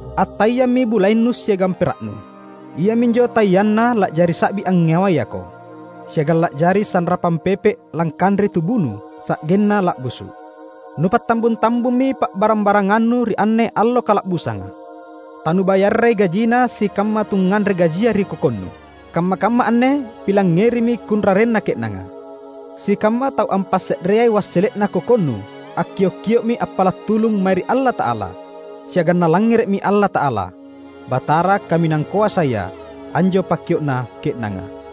Attaiammi bulaennu siagang pera’nu; iaminjo taianna la’jari sa’bi angngewayako siagang la’jari sanrapang pepe’ langkanreai tubunu sa’genna la’busu’. Nupattambung-tambummi pa’barang-barangannu ri anne allo kala’busanga. Tanubayarrai gajina sikamma tungnganre gajia ri kokonnu. Kamma-kamma anne pilangngerimi kunrarenna ke’nanga! Sikamma tau ampasse’reai wassele’na kokonnu akkiok-kio’mi appala’ tulung mae ri Allata’ala; siagang Nalangngere’mi Allata’ala, Batara Kaminang Koasaya anjo pakkio’na ke’nanga.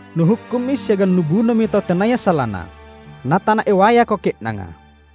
Nuhukkummi siagang nubunomi tau tenaya salana, na tanaewayako ke’nanga.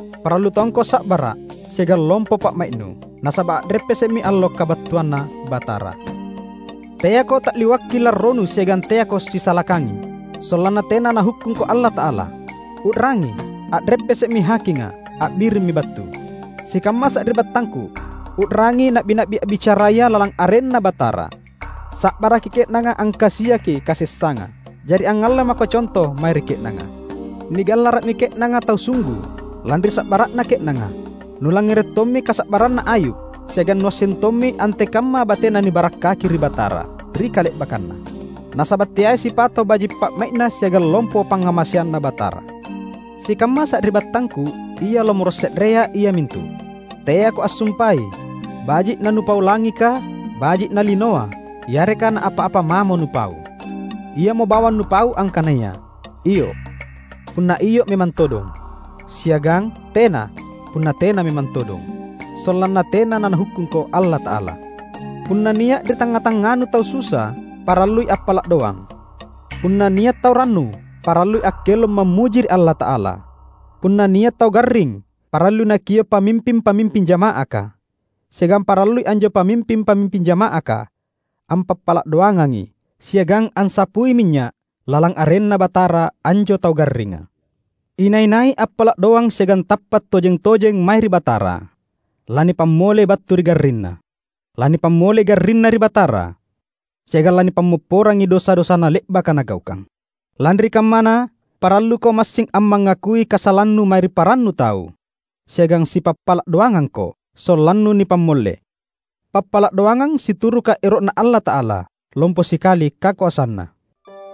Parallu tongko sa’bara’ siagang lompo pa’mai’nu, nasaba’ a’reppese’mi allo kabattuanNa Batara. Teako ta’liwakki larronu siagang teako sisalakangi, sollanna tena Nahukkungko Allata’ala. U’rangi! A’reppese’mi hakinga! A’birimmi battu! Sikamma sari’battangku, u’rangi na’bi-na’bi a’bicaraya lalang arenNa Batara. Sa’baraki ke’nanga angkasiaki kasessanga. Jari angngalle mako conto mae ri ke’nanga. Nigallara’mi ke’nanga tau sunggu, lanri sa’bara’na ke’nanga. Nulangngere’ tommi kasa’barranna Ayub, siagang nuasseng tommi antekamma batena nibarakkaki ri Batara, ri kale’bakkanna. Nasaba’ teai sipato’ baji’ pa’mai’Na siagang lompo pangngamaseanNa Batara. Sikamma sari’battangku; ia lomoro’ se’rea, iamintu: Teako assumpai, baji’ nanupau langika, baji’ nalinoa, yareka naapa-apa mamo nupau. Iamo bawang nupau angkanaya "Iyo" punna iyo memang todong, siagang "Tena" punna tena memang todong; sollanna tena naNahukkungko Allata’ala. Punna nia’ ri tangnga-tangnganu tau susa, parallui appala’ doang. Punna nia’ tau rannu, parallui akkelong mammuji ri Allata’ala. Punna nia’ tau garring parallui nakio’ pamimping-pamimping jama’aka. Siagang parallui anjo pamimping-pamimping jama’aka ampappala’ doangangi siagang ansapui minynya’ lalang arenNa Batara anjo tau garringa. Inai-nai appala’ doang siagang tappa’ tojeng-tojeng mae ri Batara, lanipamollei battu ri garrinna. Lanipamollei garrinna ri Batara, siagang lanipammopporangi dosa-dosana le’baka nagaukang. Lanri kammana, paralluko massing ammangakui kasalannu mae ri parannu tau, siagang sipappala’ doangangko, sollannu nipammolle. Pappala’ doangang situruka ero’Na Allata’ala, lompo sikali kakoasanna.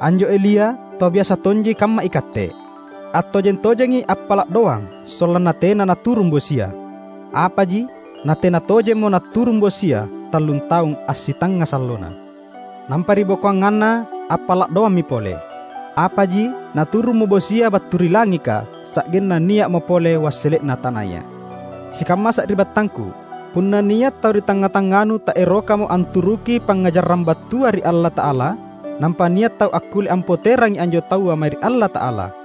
Anjo Elia, tau biasa tonji kamma ikatte. Attojeng-tojengi appala’ doang sollanna tena naturung bosia; apaji natena tojemmo naturung bosia tallun taung assitangnga sallona. Nampa ribokoanganna appala’ doammi pole; apaji naturummo bosia battu ri langika sa’genna nia’mo pole wassele’na tanaya. Sikamma sari’battangku! Punna nia’ tau ri tangnga-tangnganu taerokamo anturuki pangngajarang battua ri Allata’ala, nampa nia’ tau akkulle ampoterangi anjo taua mae ri Allata’ala,